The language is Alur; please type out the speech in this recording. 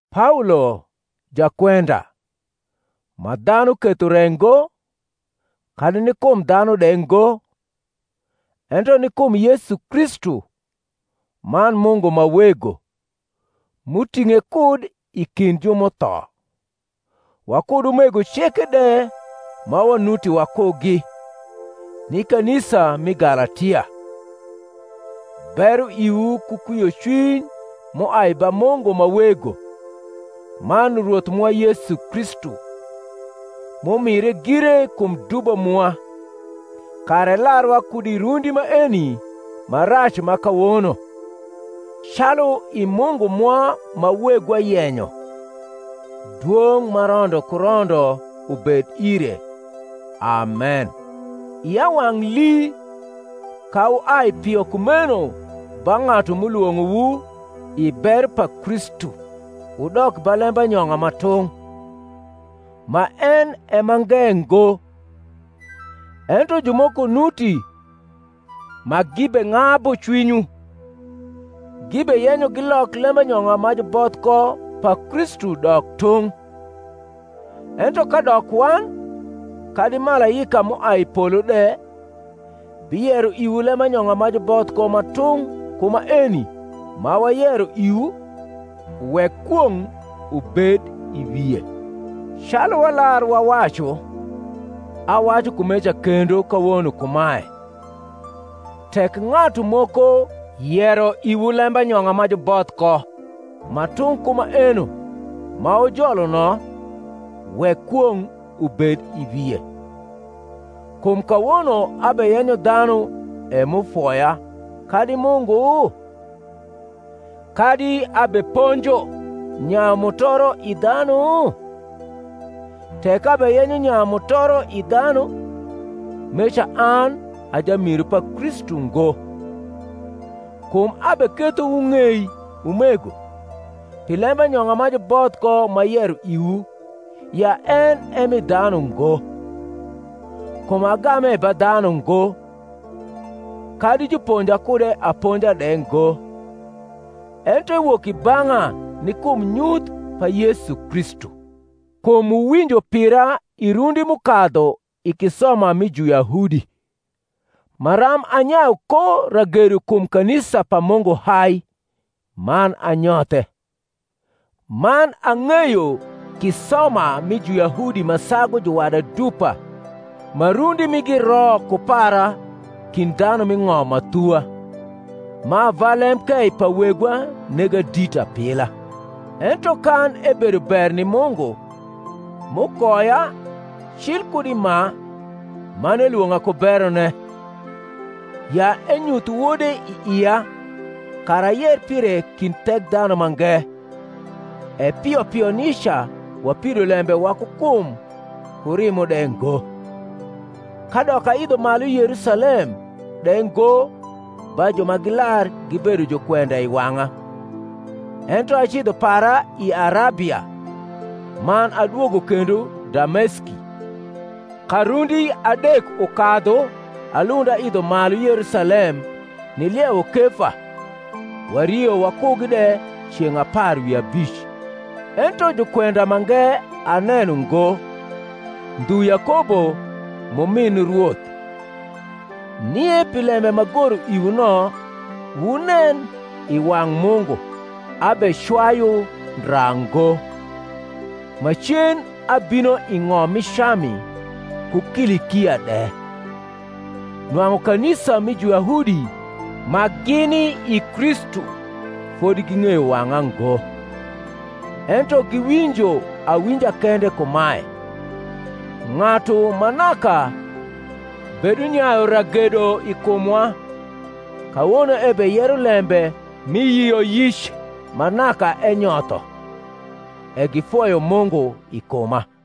Paolo, jakwenda (ma dhanu ketho re ngo, kadi ni kum dhanu de ngo, ento ni kum Yesu Kristu, man Mungu ma Wego, m’uting’e kud i kind ju m’utho), wakud umego ceke de ma wanuti wakugi, ni kanisa mi Galatia: Bero iwu ku kwiocwiny m’uai ba Mungu ma Wego, man Rwoth mwa Yesu Kristu, m’umire gire kum dubo mwa, kara elarwa kud i rundi maeni ma rac ma kawono, calu i Mungu mwa ma Wegwa yenyo: dwong’ ma rondo ku rondo ubed ire. Amen. Ia wang’ lii ka wuai pio kumeno ba ng’atu m’ulwong’owu i bero pa Kristu wudok ba lembanyong’a ma tung’; ma en e mange ngo: ento jumoko nuti ma gibeng’abu cwinywu, gibeyenyo gilok lembanyong’a ma juboth ko pa Kristu dok tung’. Ento kadok wan, kadi malaika m’uai i polo de, biyero iwu lembanyong’a ma juboth ko ma tung’ ku maeni ma wayero iwu, wek kwong’ ubed i wie. Calu walar wawacu, awacu kumeca kendo kawono kumae, Tek ng’atu moko yero iwu lembanyong’a ma juboth ko ma tung’ ku maeno ma wujolo no, wek kwong’ ubed i wie. Kum kawono abeyenyo dhanu e m’ufoya, kadi Mungu? kadi abeponjo nyayu mutoro i dhanu? tek abeyenyo nyayu mutoro i dhanu, meca an a jamiru pa Kristu ngo. Kum abeketho wung’ei, umego, pi lembanyong’a ma juboth ko m’ayero iwu, ya en e mi dhanu ngo. Kum agame ba dhanu ngo, kadi juponja kude aponja de ngo, ento ewok i bang’a ni kum nyuth pa Yesu Kristu. Kum wuwinjo pira i rundi m’ukadhu i kisoma mi Juyahudi, maram anyayu ko ragedo kum kanisa pa Mungu hai, man anyothe: man ang’eyo kisoma mi Juyahudi ma sagu juwada dupa ma rundi migi ro ku para kind dhanu m’i ng’om ma thuwa, ma ava lemkei pa wegwa nega dit apila. Ento kan ebedo ber ni Mungu, m’ukoya, cil kud i ma, man elwong’a ku berone, ya enyuth Wode i ia, kara ayer pire kind Thekdhanumange; e pio pio nica wapido lembe waku kum ku rimo de ngo: kadok aidho malu Yerusalem de ngo ba ju ma gilar gibedo jukwenda i wang’a: ento acidho para i Arabia; man adwogo kendo Dameski. Ka rundi adek ukadhu alund aidho malu Yerusalem niliewo Kefa, wario wakugi de ceng’ apar wi abic. Ento jukwenda mange aneno ngo, ndhu Yakobo m’umin Rwoth. Nie pi lembe m’agoro iwu no, wunen, i wang’ Mungu, abecwayu ndra ngo. Macen abino i ng’om mi Cami ku Kilikia de. Nwang’u kanisa mi Juyahudi ma gini i Kristu fodi ging’eyo wang’a ngo: ento giwinjo awinja kende kumae, Ng’atu ma naka bedunyayu ragedo i kumwa kawono ebeyero lembe mi yioyic ma naka enyotho; e gifoyo Mungu i kuma.